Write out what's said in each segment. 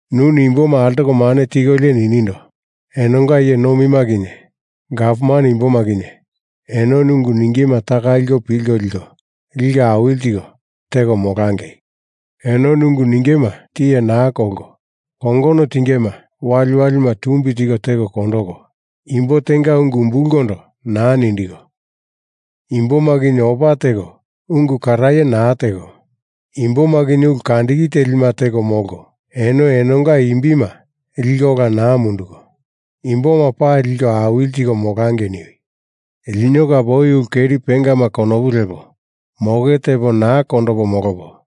Nuni imboma altoko mane tikolio ninindo, enonga iye nomima kinye gavman imboma kinye enoni ungu ningema taka liko pilko liko, liko awili tiko teko molangei. Enoni ungu ningema tiye naa kolko, kongono tingema waliwalima tumbi tiko teko kondoko, imbo tenga ungu umbulkondo naa nindiko, imboma kinye opa teko ungu karaye naa teko, imboma kinye ulu kandiki telima teko molko, eno enonga imbima liko ola naa munduko, imboma pali liko awili tiko molangei niwi! Lino kape oi ulu keri pengama konopu lepo moke tepo naa kondopo molopo,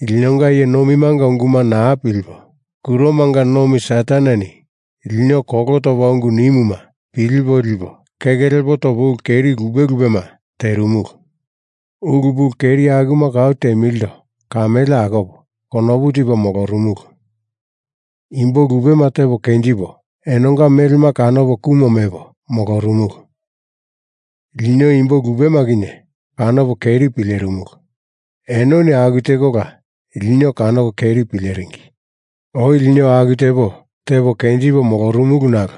linonga iye nomimanga unguma naa pilipo, kuromanga nomi Sataneni lino kolo topa ungu nimuma pilipo lipo keke lepo topo ulu keri lupe lupema terimulu. Ulu pulu keri akuma kau temilindo kamele akopo konopu tipo molorumulu. Imbo lupema tepo kenjipo enonga melema kanopo kumo mepo molorumulu. Lino imbo lupema kinye kanopo keri pilerimulu, enoni aku tekola lino kanoko keri pileringi. Oi lino aku tepo tepo kenjipo molorumulu nalo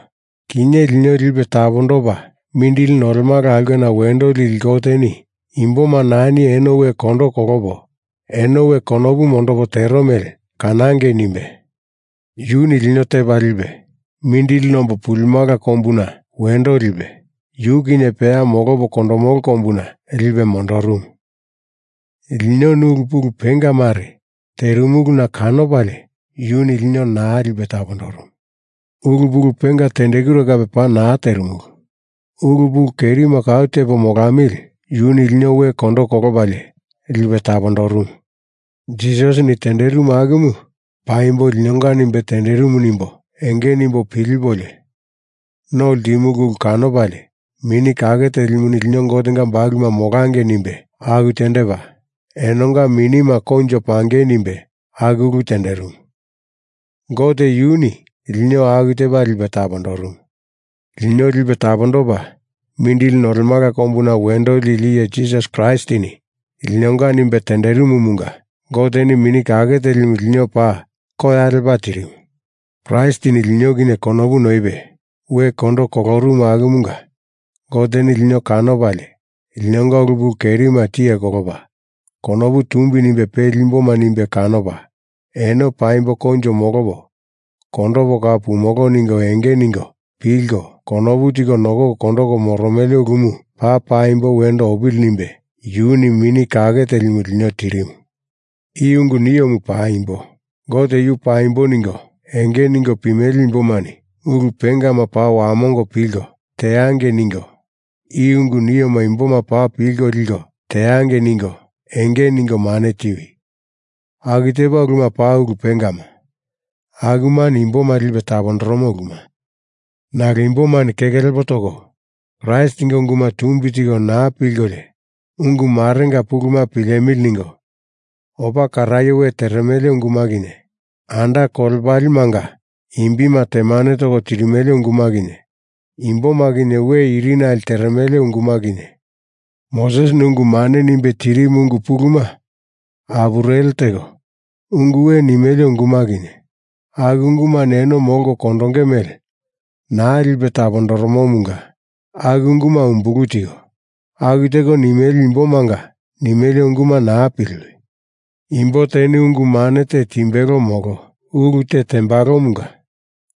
kinye, lino Lipe Tapondopa Mindili Nolemala Aulkena Wendo Lili Goteni imboma nani eno we kondo kolopo eno we konopu mondopo tero mele kanangei nimbe yuni lino tepa lipe, mindili nombo pulimala kombuna wendo lipe, yu kinye peya molopo kondomolo kombuna lipe mondorumu. Linoni ulu pulu penga mare terimuluna kanopalie yuni lino naa lipe tapondorumu. Ulu pulu penga tendekure kape paa naa terimulu. Ulu pulu kerima kau tepo molamili yuni lino we kondo kolopalie lipe tapondorumu. Jisasini tenderimu akumu paimbo linonga nimbe tenderimu nimbo enge nimbo pilipolio no ltimulu ulu kanopalie Mini Kake Telimuni lino Gotenga bakuluma molangei nimbe aku tendepa, enonga minima koinjo pangei nimbe aku ulu tenderimu. Gote yuni lino aku tepa lipe tapondorumu. Lino Lipe Tapondopa Mindili Nolemala Kombuna Wendo Lili Iye Jisas Kraistini linonga nimbe tenderimumunga Goteni Mini Kake Telimu lino paa koya lepa tirimu. Kraistini lino kinye konopu noipe we kondo kolorumu akumunga Goteni lino kanopalie linonga ulu pulu kerima tiye kolopa konopu tumbi nimbe peli imboma nimbe kanopa, eno paimbo koinjo molopo kondopo kau pumolo ningo enge ningo pilko konopu tiko nokoko kondoko moromele ulumu paa paimbo wendo opili nimbe yuni Mini Kake Telimu lino tirimu. I ungu niomu paimbo. Gote yu paimbo ningo enge ningo pimele imbomani ulu pengama paa wamongo pilko teangei ningo i ungu nioma imboma paa pilko liko teangei ningo enge ningo mane tiwi. Aku tepa uluma paa ulu pengama, akumani imboma lipe tapondoromo uluma. Nalo imbomani keke lepo toko Kraistinga unguma tumbi tiko naa pilkolio ungu marenga puluma pilemili ningo opa karaye we teremele unguma kinye, anda kolepalemanga imbima temane toko tirimele unguma kinye, imboma kinye we irinale teremele unguma kinye, Mosesini ungu mane nimbe tirimu ungu puluma apureli teko ungu we nimele unguma kinye, aku ungumani eno molko kondonge mele naa lipe tapondoromomunga aku unguma umbulu tiko, aku teko nimele imbomanga nimele unguma naa piliwi. Imbo teni ungu mane te timbelo molo ulu te tembalomunga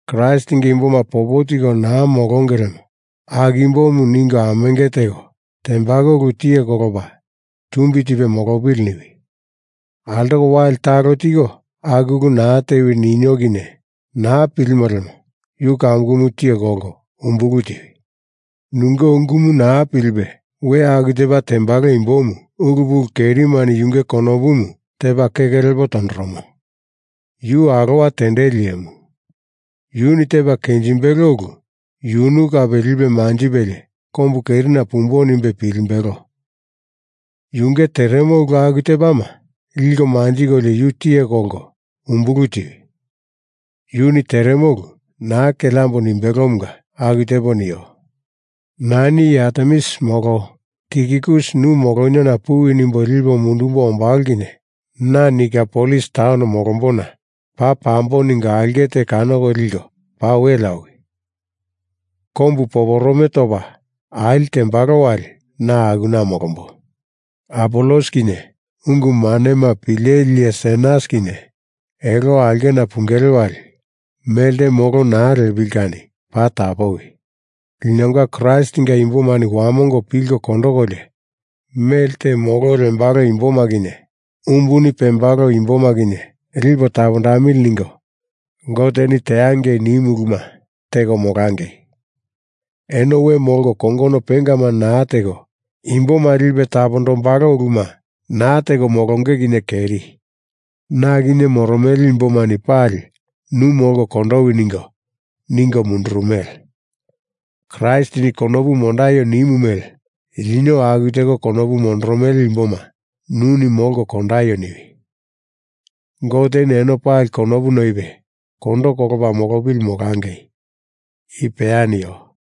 Kraistinga imboma popo tiko naa molonge lemo aku imbomu ningo amenge teko tembalo ulu tiye kolopa tumbi tipe molopili niwi. Altoko wali talo tiko aku ulu naa tewi ninio kinye naa pilimo lemo yu kamukumu tiye kolko umbulu tiwi. Nunge ungumu naa pilipe we aku tepa tembalo imbomu ulu pulu kerimani yunge konopumu tepa keke lepo tondoromo, yu alowa tendeli iyemu. Yuni tepa kenjimbelo ulu yunu kape lipe manjipelie kombu kerina pumbo nimbe pilimbelo. Yunge teremo ulu aku tepama liko manjikolio yu tiye kolko umbulu tiwi. Yuni teremo ulu naa keleambo nimbelomunga aku tepo nio. Nani iye Artemis molo Tikikus nu moloniona puwi nimbo lipo mundumbo ombalo kinye na Nikopolis taun molombona paa pambo ningo aulke te kanoko liko paa welea owi. Kombu poporome topa ali tembalo wali na akuna molombo. Apolos kinye ungu manema pileli iye Senas kinye elo aulkena pungele wali melte molo naa lepili kani paa tapowi. Linonga Kraistinga imbomani wamongo pilko kondokolio mele te molo lembalo imboma kinye umbuni pembalo imboma kinye lipo tapondamili ningo Goteni teangei nimu uluma teko molangei. Eno we molko kongono pengama naa teko imboma lipe tapondombalo uluma naa teko molonge kinye keri. Na kinye moromele imbomani pali nu molko kondowi ningo, ningo mundurumele. Kraistini konopu mondaio nimu mele lino aku teko konopu mondoromele imboma nuni molko kondaio niwi. Goteni eno pali konopu noipe kondo kolopa molopili molangei. I peya nio.